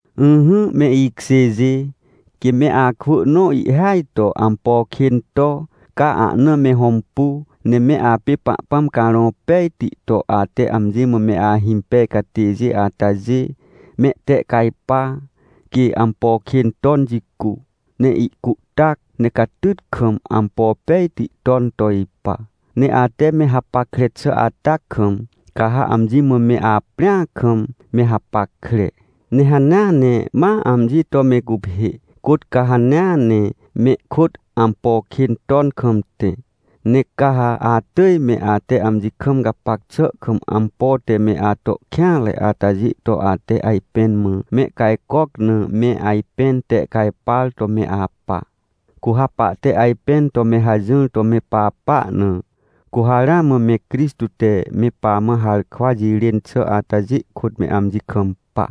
Ỹhỹ, me ikjêjê, quê me akwỳ nõ ihhêaj to ampo kên to, ca ahna me hõmpu, ne me apê Pahpãm Carõ Pejti to ate amji mã me ahimpej catêjê atajê, mehtehcajpa, quê ampo kên ton jicu, ne ihcuhtac, ne catyt kam ampo pejti ton to ipa. Ne ate me hapackre xà ata kam, ca ha amji mã me aprĩ akam, me hapackre. Ne hanea ne ma amji to me guphê, côt ca hanea ne mehkôt ampo kên ton kam tẽ. Ne ca ha atỳj me ate amji kam gapac xà kam ampo te me ato kêanre atajê to ate ajpẽn mã mehcajcoc na me ajpẽn tehcajpar to me apa. Cu ha pahte ajpẽn to me hajỹr to me papa na, cu ha ramã me Crixtô te me pamã harkwa jirên xà atajê kôt me amji kampa.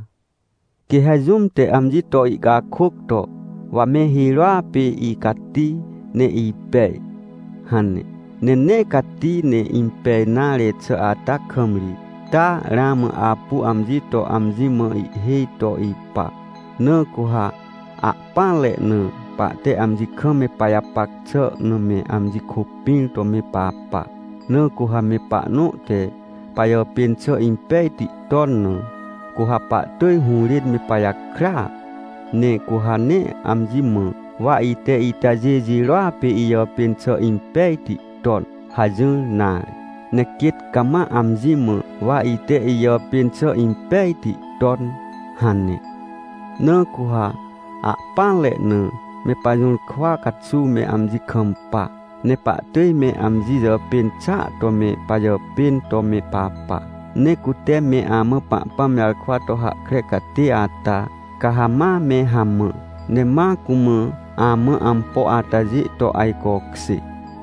Quê ha jũm te amji to ihcakôc to: — Wa me hirôa pê icati, ne ipej — hane, ne nee cati ne impej nare xà ata kam ri, taa ramã apu amji to amji mã ihhêj to ipa. Na cu ha ahpỹanre na, pahte amji kam me pajapac xà na me amji kôpĩr to me papa. Na cu ha me pahnõ te pajàpên xà impejti ton na, cu ha pahtỳj hũrên me pajakrya, ne cu ha nee amji mã: — Wa ite itajê jirôa pê ijàpên xà impejti ton — hajỹr nare. Ne quêt cama amji mã: — Wa ite ijàpên xà impejti ton — hane. Na cu ha ahpỹanre na, me pajũrkwa caxuw me amji kampa, ne pahtỳj me amji jàpên xàa to me pajàpên to me papa. Ne cute me amã Pahpãm jarkwa to hahkre catê ata, ca ha ma me hamã, ne ma cumã, amã ampo atajê to ajcokjê.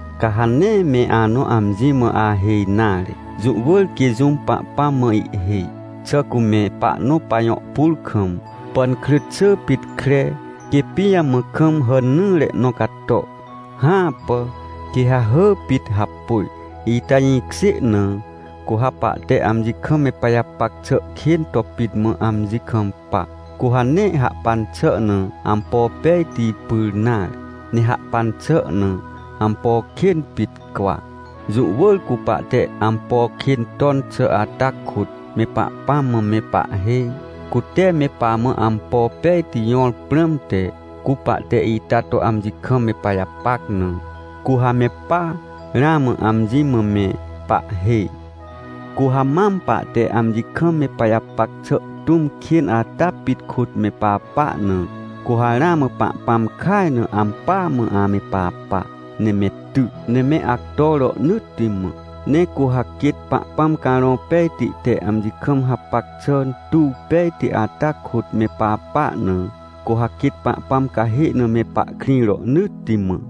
Ca ha nee me anõ amji mã ahêj nare! Jũ wỳr quê jũm Pahpãm mã ihhêj. Xà cu me pahnõ pajõ pur kam, pànkrỳt xỳ pit kre, quê pijamã kam hàn nỹre nõ cato? Hãpà! Quê ha hỳ pit hapôj. Ita jĩkjê na, cu ha pahte amji kam me pajapac xà kên to pit mã amji kampa, cu ha nee hahpan xà na ampo pejti pyr nare, ne hahpan xà na ampo kên pit cwa. Jũ wỳr cu pahte ampo kên ton xà ata kôt, me Pahpãm mã me pahhêj, cute me pamã ampo pejti jõr prãmte. Cu pahte ita to amji kam me pajapac na, cu ha me paa, ramã, amji mã me pahhêj. Cu ha mam pahte amji kam me pajapac xà tũm kên ata pit kôt me papa na, cu ha ramã Pahpãm kaj na ampỳa mã ame papa, ne me ty, ne me acto rohnỳtti mã. Ne cu ha quêt Pahpãm Carõ Pejti te amji kam hapac xà tuw pejti ata kôt me papa na, cu ha quêt Pahpãm cahê na me pahkrĩ rohnỳtti mã.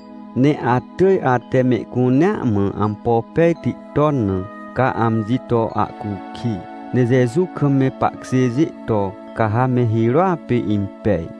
Ne atỳj ate mehcunea mã ampo pejti ton na, ca amji to ahcukij. Ne Jeju kam me pahkjêjê to, ca ha me hirôa pê impej.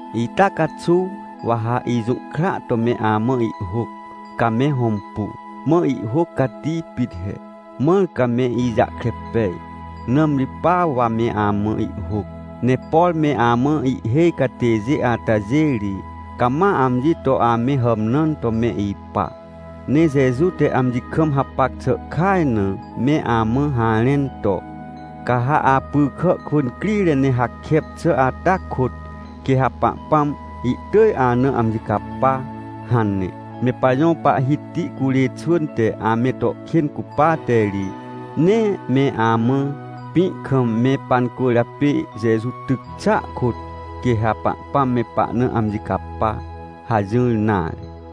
Ita caxuw, wa ha ijũhkra to me amã ihhôc, ca me hõmpu. Mã ihhôc cati pit he, mãr ca me ijahkre pej, nãmri pa wa me amã ihhôc. Ne por me amã ihhêj catêjê atajê ri, cama amji to ame hàmnãn to me ipa. Ne Jeju te amji kam hapac xà kaj na me amã harẽn to: — Ca ha apy kà kwỳ crire ne hakep xà ata kôt, quê ha Pahpãm ihtỳj ana amji capa — hane. Me pajõ Pahhiti curê xwỳn te ame to kên cupate ri, nee me amã: — Pĩ kam me pancwỳrjapê Jeju tyc xàa kôt, quê ha Pahpãm me pahna amji capa — hajỹr nare.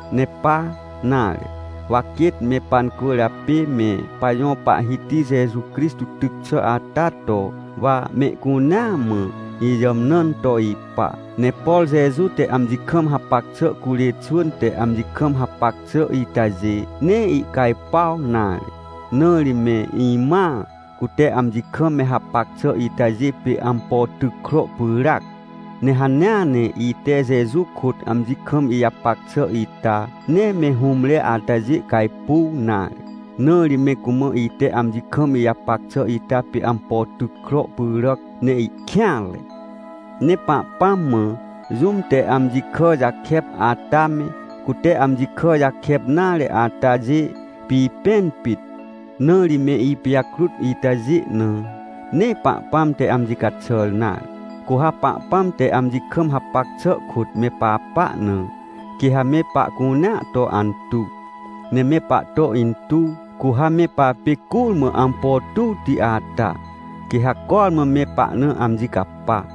Ne pa nare, wa quêt me pancwỳrjapê me pajõ Pahhiti Jeju Crixtô tyc xà ata to, wa mehcunea mã, ijàmnãn to ipa. Ne por Jeju te amji kam hapac xà curê xwỳn te amji kam hapac xà itajê, nee icajpuaw nare. Na ri me imãa, cute amji kam me hapac xà itajê pê ampo tyc kro pyràac. Ne hanea ne ite Jeju kôt amji kam ijapac xà ita, nee me hũmre atajê cajpuw nare. Na ri me cumã ite amji kam ijapac xà ita pê ampo tyc kro pyràc, ne ihkêanre. Ne Pahpãm mã, jũm te amji kà jakep ata me, cute amji kà jakep nare atajê pipẽn pit, na ri me ipijakrut itajê na, nee Pahpãm te amji caxàr nare. Cu ha Pahpãm te amji kam hapac xà kôt me papa na, quê ha me pahcunea to antuw, ne me pahto intuw. Cu ha me papê curmã ampo tuwti ata, quê ha cormã me pahna amji capa.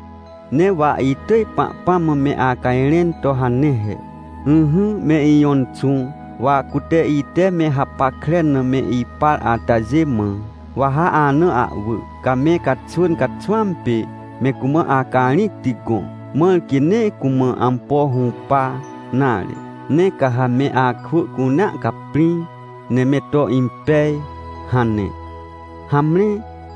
Ne wa itỳj Pahpãm mã me acajrẽn to hane he: — Ỹhỹ me Ijõ Inxũ, wa cute, ite me hapackre na me ipar atajê mã, wa ha ana ahwỳ, ca me caxwỳn caxwãm pê me cumã acarĩcti gõ, mãr quê nee cumã ampo hũpa nare. Ne ca ha me akwỳ cunea caprĩ, ne me to impej — hane. Hamre,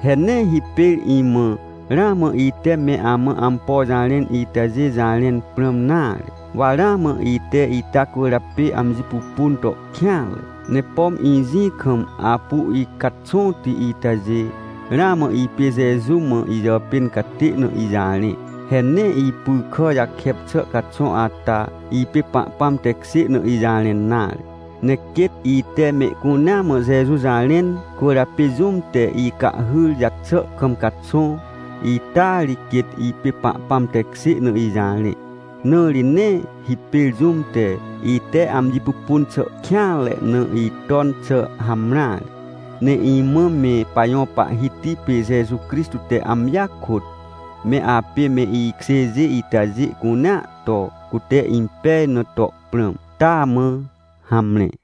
he nee hipêr imã, ramã ite me amã ampo jarẽn itajê jarẽn prãm nare. Wa ramã ite ita cwỳrjapê amji pupun to kêanre, ne pom ijĩ kam apu icaxõti itajê, ramã ipê Jeju mã ijàpên catê na ijarẽ. He nee ipy kà jakep xà caxõ ata, ipê Pahpãm tekjê na ijarẽn nare. Ne quêt ite mehcunea mã Jeju jarẽn cwỳrjapê jũm te icahhyr jaxà kam caxõ, ita ri quêt ipê Pahpãm tekjê na ijarẽ. Na ri nee hipêr jũm te, ite amji pupun xà kêanre na iton xà hamreare. Ne imã me pajõ Pahhiti pê Jeju Crixtô te amjia kôt, me apê me ikjêjê itajê cunea to, cute impej na to prãm. Taa mã, hamre.